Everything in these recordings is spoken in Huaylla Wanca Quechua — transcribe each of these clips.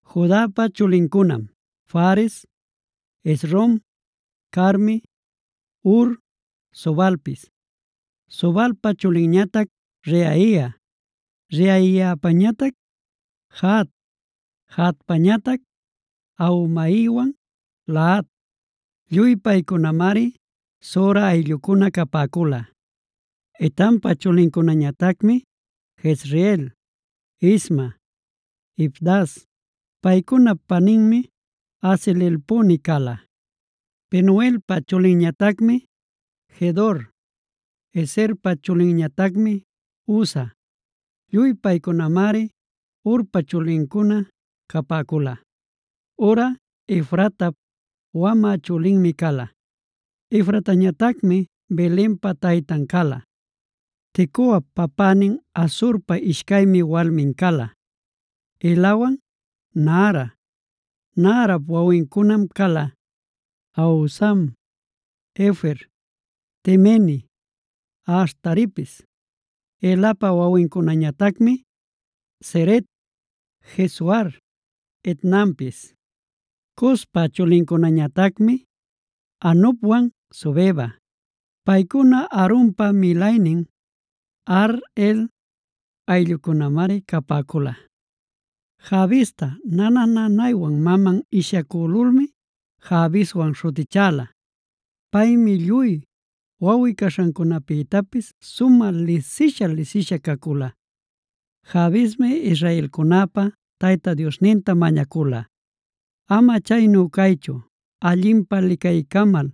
Judapa chulincunam: Fares, Hezron, Carmi, Hur, Sobalpis. Sobalpa chulinñatac Reaia, Reaiapañatac Jahat, Jahatpañatac Ahumaiwan Lahad. Lluy paycunamari Zora ayllucuna capäcula. Etampa chulincunañatacmi: Jezreel, Isma, Ibdas; paycunap paninmi Haze-lelponi cala. Penuelpa chulinñatacmi Gedor. Ezerpa chulinñatacmi Husa. Lluy paycunamari Hurpa chulincuna capäcula. Hurꞌa Efratap wamä chulinmi cala. Efratañatacmi Belenpa taytan cala. Tecoap papänin Asurpa ishcaymi walmin cala: Helawan Naara. Naarap wawincunam cala: Ahuzam, Hefer, Temeni, Ahastaripis. Helapa wawincunañatacmi: Zeret, Jezoar, Etnanpis. Cospa chulincunañatacmi Anubwan Zobeba. Paycuna Harumpa milaynin Aharhel ayllucunamari capäcula. Jabesta nana-nanaywan maman ishyacülulmi Jabeswana śhutichäla. Paymi lluy wawꞌi-caśhacunapïtapis sumä lisisha-lisisha cacula. Jabesmi israelcunäpa Tayta Diosninta mañacula: “Ama chaynu caychu, allinpä licaycamal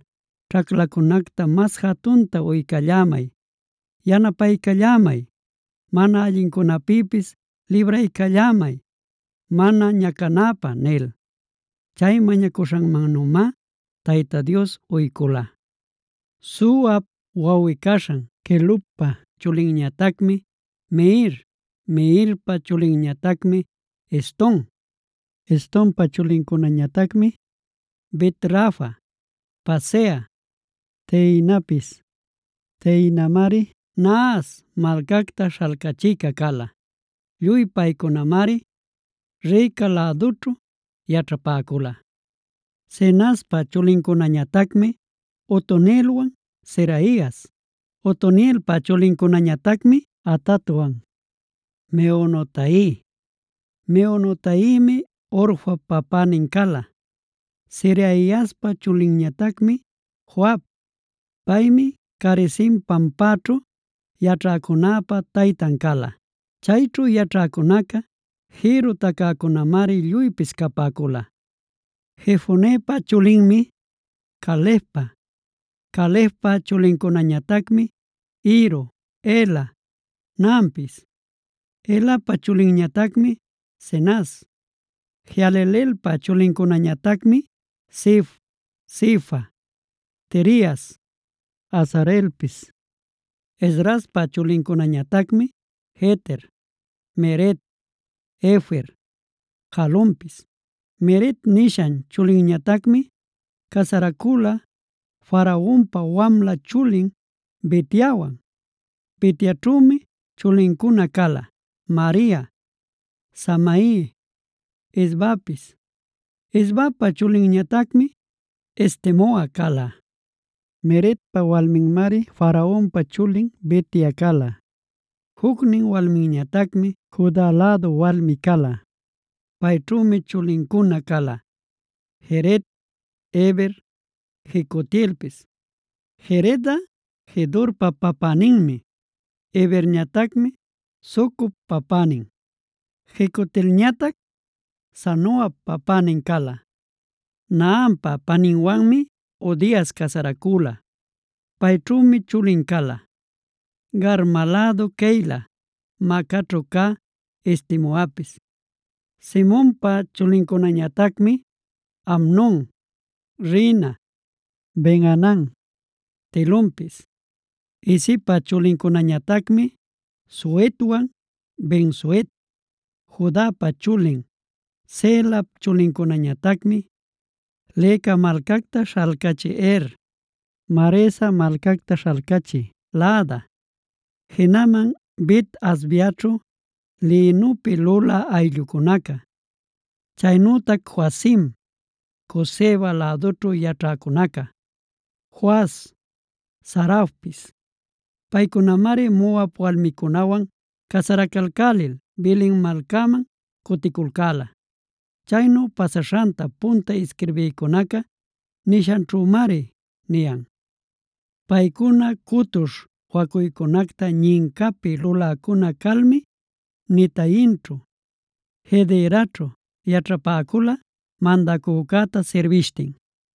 ćhaclacunacta mas jatunta uycallämay, yanapaycallämay, mana allincunäpïpis libraycallämay mana ñacanäpä” nil. Chay mañacuśhanmannümá Tayta Dios uycula. Suhap wawꞌi-caśhan Quelubpa chulinñatacmi Mehir. Mehirpa chulinñatacmi Eston. Estonpa chulincunañatacmi: Bet-rafa, Paseah, Tehinapis. Tehinamari Nahas malcacta śhalcachïca cala. Lluy paycunamari Reca lädućhu yaćhapäcula. Cenazpa chulincunañatacmi Otonielwan Seraias. Otonielpa chulincunañatacmi Hatatwan, Meonotai. Meonotaimi Ofrap papänin cala. Seraiaspa chulinñatacmi Joab; paymi Carisim pampaćhu yaćhäcunäpa taytan cala. Chayćhu yaćhäcunaca jïrru tacäcunamari lluypis capäcula. Jefonepa chulinmi Calebpa, Calebpa chulincunañatacmi: Iru, Ela, Naampis. Elapa chulinñatacmi Cenaz. Jehalelelpa chulincunañatacmi: Zif, Zifa, Tirias, Asareelpis. Esdraspa chulincunañatacmi: Jeter, Mered, Efer, Jalonpis. Mered nishan chulinñatacmi casaracüla Faraonpa wamla chulin Bitiawan. Bitiaćhümi chulincuna cala: Maria, Samai, Isbapis; Isbapa chulinñatacmi Estemoa cala. Meredpa walminmari Faraonpa chulin Bitia cala. Jucnin walminñatacmi Juda lädu walmi cala. Payćhümi chulincuna cala: Jered, Heber, Jecutielpis. Jeredꞌa Gedorpa papäninmi, Heberñatacmi Socop papänin, Jecutielñatac Zanoapa papänin cala. Nahampa paninwanmi Hodias casaracüla. Payćhümi chulin cala: Garma lädu Keila, Maacaćhu cä Estemoapis. Simonpa chulincunañatacmi: Amnon, Rina, Ben-hanan, Tilonpis. Isipa chulincunañatacmi Zohetwan Benzohet. Judapa chulin Selap chulincunañatacmi: Leca malcacta śhalcachï Er, Maresa malcacta śhalcachï Laada, jinaman Bet-asbeaćhu lïnupi lulä ayllucunaca, chaynütac Joacim, Cozeba lädućhu yaćhäcunaca, Joas, Sarafpis. Paycunamari Moab walmicunawan casaracalcälil Belen malcaman cuticulcäla. Caynu pasaśhanta punta isquirbïcunaca nishanćhümari niyan. Paycuna cutuśh wacuycunacta ñincapi luläcuna calmi Netaimćhu, Guederaćhu yaćhapäcula, mandacücäta sirbishtin.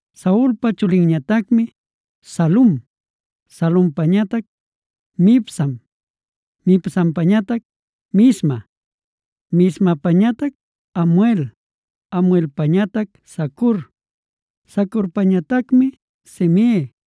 Saulpa chulinñatacmi Salum, Salumpañatac Mibsam, Mibsampañatac Misma, Mismapañatac Hamuel, Hamuelpañatac Zacur, Zacurpañatacmi Simei.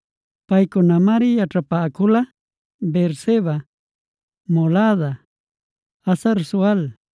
Paycunamari yaćhapäcula: Beerseba, Molada, Hazar-sual,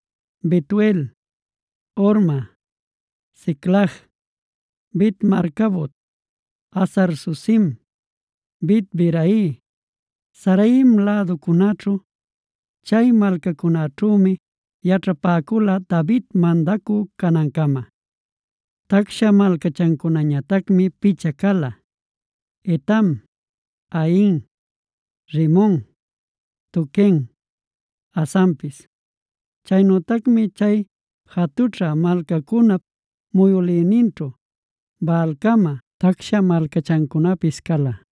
Betuel, Horma, Siclag, Bet-marcabot, Hazar-susim, Bet-birai, Saaraim läducunaćhu. Chay malcacunäćhümi yaćhapäcula David mandacü canancama. Tacsha malcachancunañatacmi picha cala: Etam, Ain, Rimon, Toquen, Asanpis. Chaynütacmi chay jatućha malcacunap muyülïninćhu Baalcama tacsha malcachancunapis cala.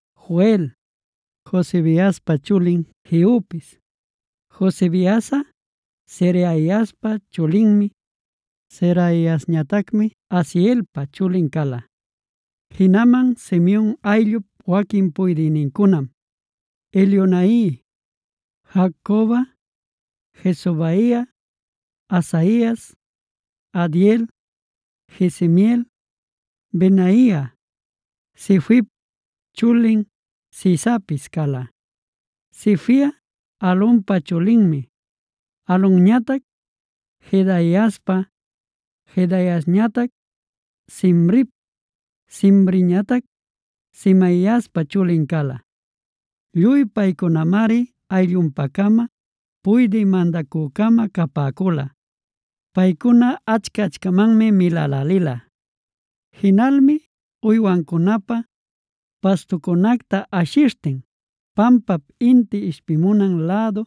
Joel, Josibiaspa chulin Jehupis; Josibiasꞌa Seraiaspa chulinmi, Seraiasñatacmi Asielpa chulin cala. Jinaman Simeon ayllup waquin puydïnincunam: Elioenai, Jaacoba, Jesohaia, Asaias, Adiel, Jesimiel, Benaia, Sifip chulin Zizapis cala. Sifiꞌa Alonpa chulinmi, Alonñatac Jedaiaspa, Jedaiasñatac Simrip, Simriñatac Semaiaspa chulin cala. Lluy paycunamari ayllunpa-cama puydï mandacü-cama capäcula. Paycuna achca-achamanmi milälälila. Jinalmi uywancunapä pastucunacta ashishtin pampap inti ishpimunan lädu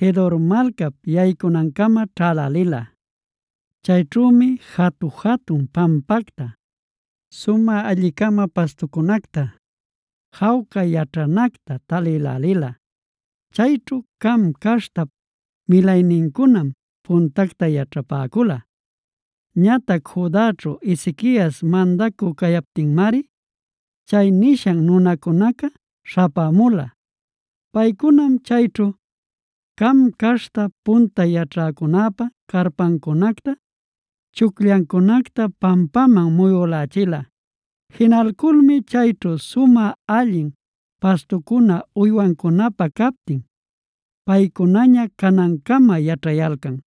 Gedor malcap yaycunancama ćhälälila. Chayćhümi jatu-jatun pampacta, sumä alli-cama pastucunacta, jawca yaćhanacta talïlälila. Chayćhu Cam caśhtap milaynincunam puntacta yaćhapäcula. Ñatac Judaćhu Ezequias mandacü cayaptinmari chay nishan nunacunaca śhapämula. Paycunam chayćhu Cam caśhta punta yaćhäcunäpä carpancunacta, chucllancunacta pampaman muyülächila. Jinalculmi chayćhu sumä allin pastucuna uywancunapä captin paycunaña canancama yaćhayalcan.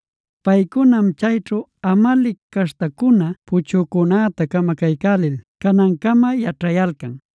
Paycunam chayćhu Amalec caśhtacuna puchücunäta camacaycälil canancama yaćhayalcan.